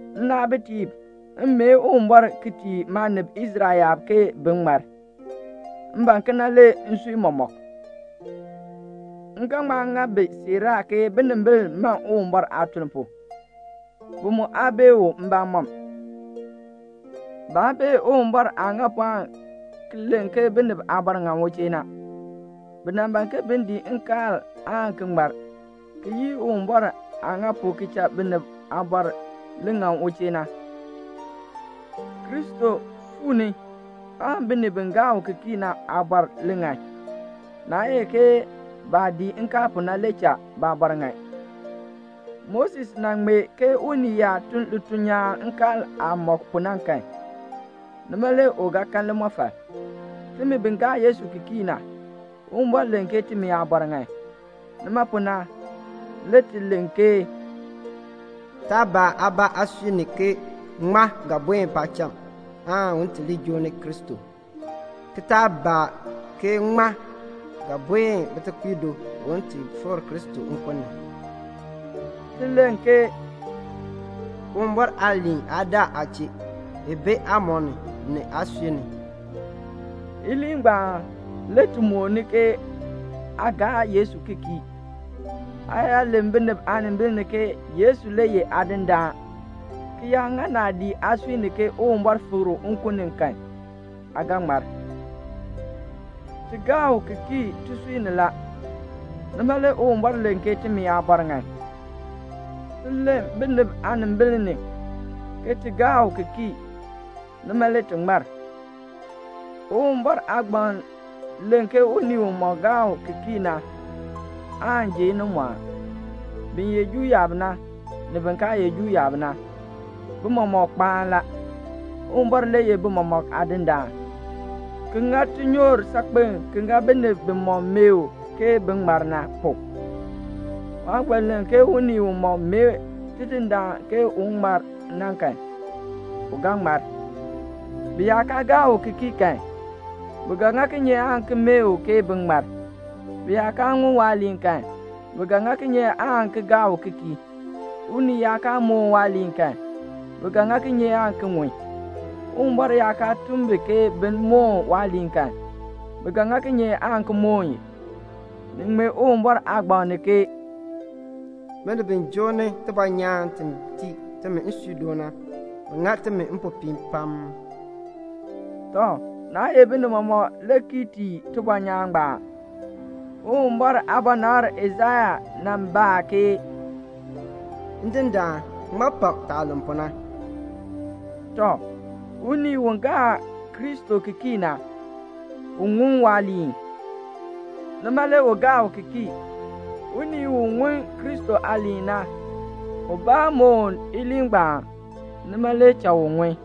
Nnaabitiib, m mee Uwumbɔr ki tii maanib Israel yaab ke bin ŋmar. M ban kena le nsui mɔmɔk. M ga ŋma ŋa bi siiraa ke binimbil man Uwumbɔr aatuln pu. Bi mu aa bee u mbamɔm. Baa bee Uwumbɔr aah ŋa pu aan ki len ke binib aabɔr ŋan u chee na. Bi nan ban ke bin dii nkaal aan ki ŋmar, ki yii Uwumbɔr aah ŋa pu ki cha binib aabɔr li ŋan u chee na. Kristo fuu ni aan binib bi gaa u ki kii na aabɔr li ŋan. Naa ye ke baah dii nkaal pu na le cha baabɔr ŋan. Moses nan ŋmee ke unii yaa tun lituln nyaan nkaal aah mɔk pu na kan, nima le u ga kan limɔfal. Timi bi gaa Yesu ki kii na, Uwumbɔr len ke timi aabɔr ŋan. Nima pu na le ti len ke "Taa baa aabaa aasui ni ke 'Ŋmaa ga buen paacham un ti li joo ni Kristo?' ki taa baa ke 'Ŋmaa ga buen bitekpiib do un ti fikr Kristo nkun ni?"' Ti len ke "Uwumbɔr aaliin aa daa aa chee. I bi aamɔb ni, ni aasui ni." Iliin ngbaan le ti mooni ke aa gaa Yesu ki kii. Aa yaa len binib aanimbil ni ke Yesu le ye Aadindaan, ki yaa ŋa naadii aasui ni ke Uwumbɔr fikr u nkun ni kan, aa ga ŋmar. Ti gaa u ki kii tisui ni la, nima le Uwumbɔr len ke timi aabɔr ŋan. Ti len binib aanimbil ni ke ti gaa u ki kii, nima le ti ŋmar. Uwumbɔr Aagbaŋ len ke unii umɔk gaa u ki kii na aan ji inimɔɔn. Bin ye Juu yaab na, ni bin kaa ye Juu yaab na, bi mɔmɔk kpaan la. Uwumbɔr le ye bi mɔmɔk Aadindaan, ki ŋa tinyoor saakpen ki ŋa binib bimɔk mee u ke bin ŋmar na pu. Waagbaŋ len ke unii umɔk mee Tidindaan ke un ŋmar na kan, u ga ŋmar. Bi yaa kaa gaa u ki kii kan, bi ga ŋa kinye aan ki mee u ke bin ŋmar? Bi yaa kaa ŋun waaliin kan, bi ga ŋa kinye aan ki gaa u ki kii? Unii yaa kaa mooni waaliin kan, bi ga ŋa kinye aan ki ŋun? Uwumbɔr yaa kaa tun bi ke bin moon waaliin kan, bi ga ŋa kinye aan ki moon i? Ni ŋmee Uwumbɔr Aagbaŋ ni ke "Binib bi joo ni tibɔnyaan ti tii timi nsuudoon na, bi ŋa timi mpopiin pam." Tɔ, naa ye binib mɔmɔk le kii tii tibɔnyaan ngbaan. Uwumbɔr aabɔnabr Aisaya nan baa ke "Ndindaan, ŋmaa pak taah len pu na?" Tɔ, unii u gaa Kristo ki kii na, u ŋun waaliin, nima le u gaa u ki kii. Unii u ŋun Kristo aaliin na, ubaa moon iliin ngbaan, nima le cha u ŋun.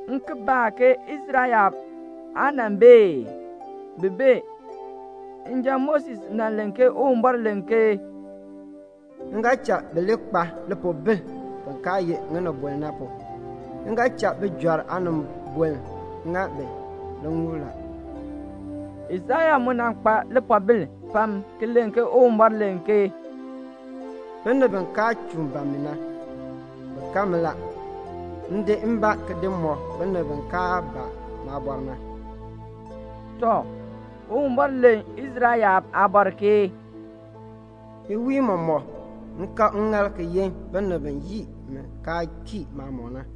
M ki baa ke "Israel yaab aa nan bee ee?" Bi bee. Njan Moses nan len ke Uwumbɔr len ke "M ga cha bi li kpa lipiipoln bin kaa ye ŋinibol na pu. M ga cha bijɔrb aanibol ŋa bi liŋuul la." Aisaya mu nan kpa lipoobil pam ki len ke Uwumbɔr len ke "Binib bi kaa chuun ban mi na, bi kan mi la. M di mbaa ki di mɔk binib bi kaa baa maabɔr na." Tɔ, Uwumbɔr len Israel yaab aabɔr ke "Iwiin mɔmɔk m kab ŋŋaal ki yin binib bi yii mi kaa kii maamɔb na."